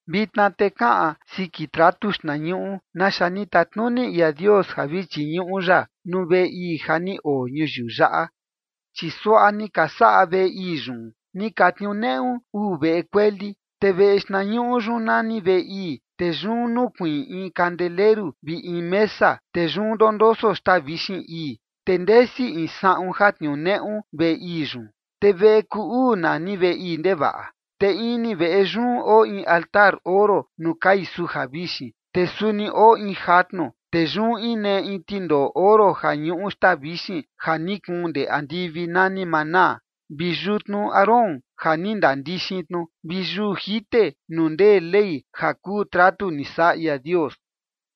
Vitna te kaꞌan siki tratu xtnañuꞌu naxa ni tatnuni ia Dios ja vi chiñuꞌu ya nuu veꞌe ii ja ni oo ñuyiu yaꞌa. Chi suaꞌa ni ka saꞌa veꞌe ii yun: ni ka tniuneꞌu uu veꞌe kueli, te veꞌe xtnañuꞌu yun nani veꞌe ii, te yun nukuiin in kandeleru vi in mesa, te yun ndondoso xtaa vixin ii. Te ndesi in saꞌun ja tniuneꞌu veꞌe ii yun, te veꞌe kuu uu nani veꞌe ii ndevaꞌa. Te ini veꞌe yun oo in altar oro nuu kai suja vixin, te suni oo in jatnu, te yun inee in tindoꞌo oro ja ñuꞌu xtaa vixin ja ni kuun ndee andivi nani manaa, vi yutnu Aarón ja ni ndandixin tnu, vi yuu jite nuu ndee Ley ja kuu tratu ni saꞌa ia Dios.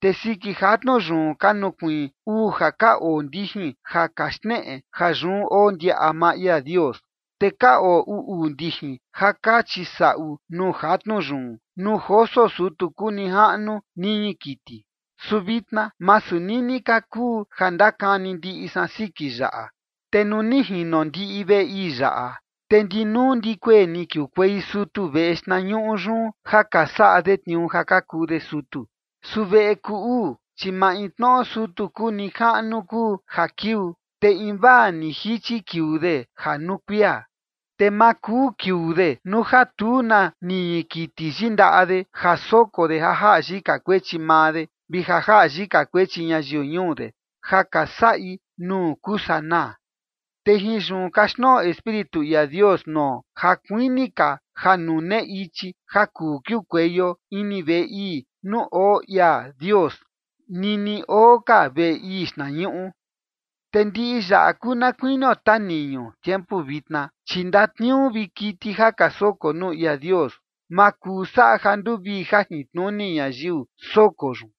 Te siki jatnu yun ka nukuiin uu ja ka oo ndijin ja ka xneꞌe ja yun oo ndiaꞌa maa ia Dios, te ka oo uu uu ndijin ja ka chisaꞌu nuu jatnu yun nuu joso sutu kuu nijaꞌnu niñi kiti, su vitna masu nini ka kuu ja ndakani ndiꞌi san siki yaꞌa. Te nuu ni jino ndiꞌi veꞌe ii yaꞌa, te ndinuu ndikuee ni kiukuei sutu veꞌe xtnañuꞌu yun ja ka saꞌa de tniuu ja ka kuu de sutu. Su veꞌe kuu uu, chi maintnoꞌo sutu kuu nijaꞌnu kuu ja kiuu, te invaa ni jichi kiuu de ja nuu kuia, te ma kuu kiuu de nuu ja tu na niñi kiti yindaꞌa de ja soko de ja jaꞌa yika kuechi maa de, vi ja jaꞌa yika kuechi ñayiu ñuu de, ja ka saꞌi nuu kuu sanaa. Te jin yun kaxtnoꞌo Espíritu ia Dios nuo ja kuini ka ja nune ichi ja kuu kiukueio ini veꞌe ii nuu oo ia Dios nini oo ka veꞌe ii xtnañuꞌu. Te ndiꞌi yaꞌa kuu na kuinio taniñu tiempu vitna, chi ndatniuu vi kiti ja ka soko nuu ia Dios, ma kuu saꞌa ja nduvii jajintnuni ñayiu soko yun.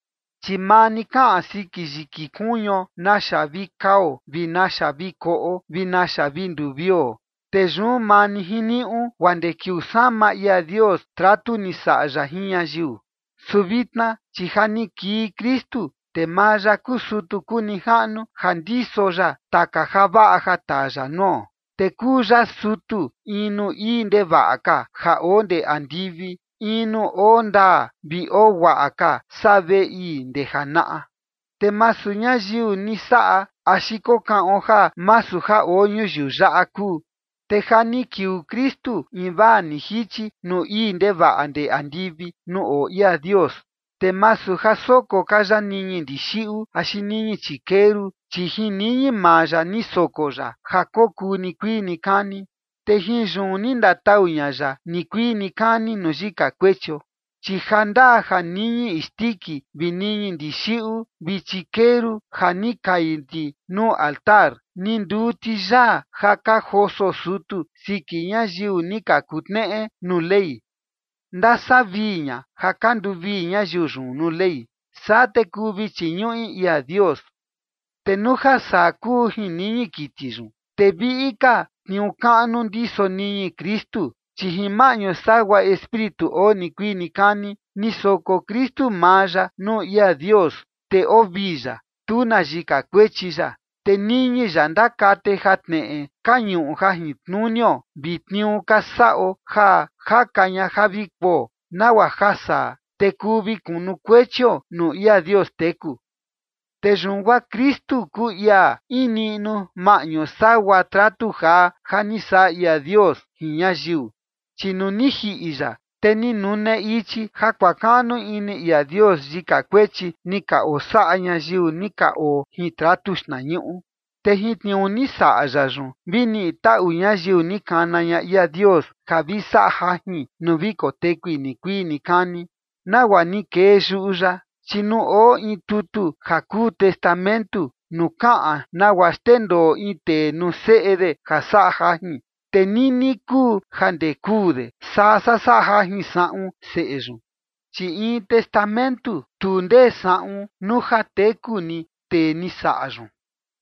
Chi maa ni kaꞌan siki yiki kuñuo, naxa vi kao vi naxa vi koꞌo vi naxa vi nduvio, te yun maa ni jiniuꞌu guaa ndee kiuu sama ia Dios tratu ni saꞌa ya jin ñayiu. Su vitna, chi ja ni kii Kristu, te maa ya kuu sutu kuu nijaꞌnu ja ndiso ya taka javaꞌa ja taa ya nuo. Te kuu ya sutu in nuu ii ndevaꞌa ka ja oo ndee andivi, in nuu oo ndaa vi oo guaꞌa ka saa veꞌe ii ndee janaꞌa, te masu ñayiu ni saꞌa axi kokaꞌon ja masu ja oo ñuyiu yaꞌa kuu. Te ja ni kiuu Kristu invaa ni jichi nuu ii ndevaꞌa ndee andivi nuu oo ia Dios, te masu ja soko ka ya niñi ndixiꞌu axi niñi chikeru, chi jin niñi maa ya ni soko ya ja kokuu nikuii nikani, te jin yun ni ndatau ña ya nikuii nikani nuu yika kuechio. Chi ja ndaa ja niñi isndiki vi niñi ndixiꞌu vi chikeru ja ni ka kai ti nuu altar, ni nduu ti yaa ja ka joso sutu siki ñayiu ni ka kutneꞌe nuu Ley, ndasavii ña ja ka nduvii ñayiu yun nuu Ley. Saa te kuu vi chiñuꞌi ia Dios. Te nuu ja saa kuu jin niñi kiti yun, te viꞌi ka tniuu kaꞌnu ndiso niñi Kristu. Chi jin maꞌñu sagua Espíritu oo nikuii nikani, ni soko Kristu maa ya nuu ia Dios, te oo vii ya, tu na yika kuechi ya. Te niñi ya ndakate jatneꞌe ka ñuꞌu jajintnunio vi tniuu ka saꞌo ja jaka ña ja vi kuo, nagua ja saa, te kuu vi kunukuechio nuu ia Dios teku. Te yun guaa Kristu kuu ia in niꞌnu maꞌñu sagua tratu jaa ja ni saꞌa ia Dios jin ñayiu. Chi nuu ni jiꞌi ya, te ni nune ichi ja kuakaꞌnu ini ia Dios yika kuechi ni ka osaꞌa ñayiu ni ka oo jin tratu xtnañuꞌu. Te jin tniuu ni saꞌa ya yun, vi niꞌi taꞌu ñayiu ni kana ña ia Dios ja vi saꞌa jajin nuu vi kotekui nikuii nikani, nagua ni kee yuꞌu ya. Chi nuu oo in tutu ja kuu testamentu nuu kaꞌan nagua xndendoo in tee nuu seꞌe de ja saꞌa jajin, te nini kuu ja ndee kuu de, saa saꞌa jajin saꞌun seꞌe yun. Chi in testamentu, tu ndee saꞌun nuu ja teku ni tee ni saꞌa yun,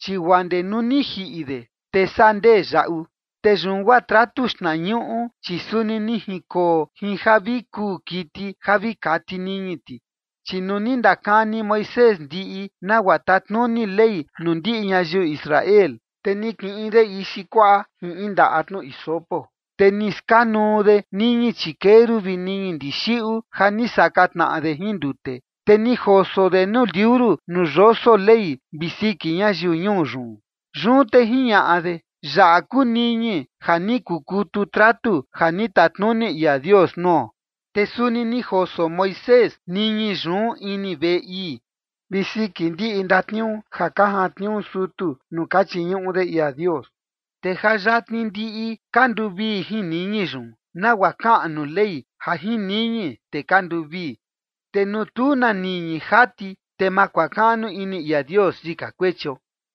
chi guaa ndee nuu ni jiꞌi de, te saa ndee yaꞌu. Te yun guaa tratu xtnañuꞌu, chi suni ni jinkoo jin ja vi kuu kiti ja vi kati niñi ti. Chi nuu ni ndakani Moisés ndiꞌi nagua tatnuni Ley nuu ndiꞌi ñayiu Israel, te ni kiꞌin de ixi kuaꞌa jin in ndaꞌa tnu hisopo, te ni skanuu de niñi chikeru vi niñi ndixiꞌu ja ni saka tnaꞌa de jin ndute, te ni joso de nuu liuru nuu yoso Ley vi siki ñayiu ñuu yun. Yun te jiñaꞌa de: “Yaꞌa kuu niñi ja ni kukutu tratu ja ni tatnuni ia Dios nuo”. Te suni ni joso Moisés niñi yun ini veꞌe ii vi siki ndiꞌi ndatniuu ja ka jantniuu sutu nuu ka chiñuꞌu de ia Dios. Te ja yatni ndiꞌi ka nduvii jin niñi yun, nagua kaꞌan nuu Ley ja jin niñi, te ka nduvii. Te nuu tu na niñi jati, te ma kuakaꞌnu ini ia Dios yika kuechio.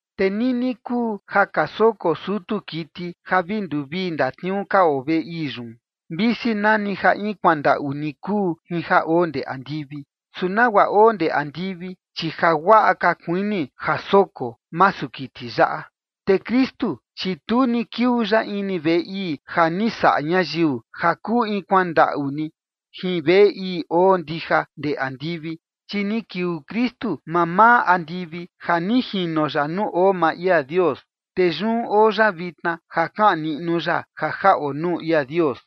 Te nini kuu ja ka soko sutu kiti ja vi nduvii ndatniuu ka oo veꞌe ii yun, visi nani ja in kuandaꞌu ni kuu jin ja oo ndee andivi. Su nagua oo ndee andivi, chi jaguaꞌa ka kuini ja soko, masu kiti yaꞌa. Te Kristu, chi tu ni kiuu ya ini veꞌe ii ja ni saꞌa ñayiu, ja kuu in kuandaꞌu ni jin veꞌe ii oo ndija ndee andivi. Chi ni kiuu Kristu mamaa andivi ja ni jino ya nuu oo maa ia Dios, te yun oo ya vitna ja kaꞌan niꞌnu ya ja jaꞌo nuu ia Dios.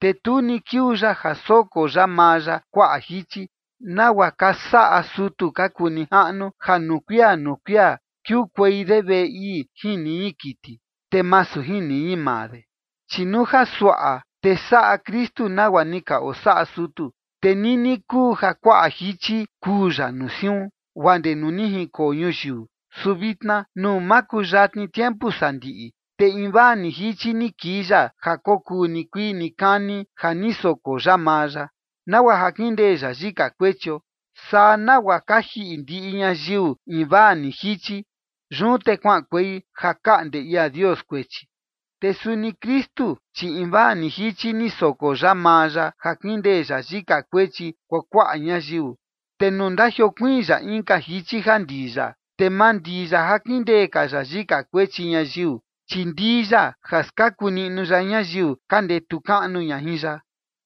Te tu ni kiuu ya ja soko ya maa ya kuaꞌa jichi, nagua ka saꞌa sutu ka kuu nijaꞌnu, ja nuu kuia nuu kuia kiukuei de veꞌe ii jin niñi kiti, te masu jin niñi maa de. Chi nuu ja suaꞌa te saꞌa Kristu nagua ni ka osaꞌa sutu, te nini kuu ja kuaꞌa jichi kuu ya nuu siun, guaa ndee nuu ni jinkoo ñuyiu. Su vitna nuu makuyatni tiempu sandiꞌi, te invaa ni jichi ni kii ya ja kokuu nikuii nikani ja ni soko ya maa ya, nagua ja kindee ya yika kuechio. Saa nagua ka jiꞌi ndiꞌi ñayiu invaa ni jichi, yun te kuaꞌankuei ja kaꞌnde ia Dios kuechi. Te suni Kristu, chi invaa ni jichi ni soko ya maa ya ja kindee ya yika kuechi kuakuaꞌa ñayiu, te nuu ndajiokuiin ya inka jichi ja ndii ya, te ma ndii ya ja kindee ka ya yika kuechi ñayiu, chi ndii ya ja skaku niꞌnu ya ñayiu ka ndetu kaꞌnu ña jin ya.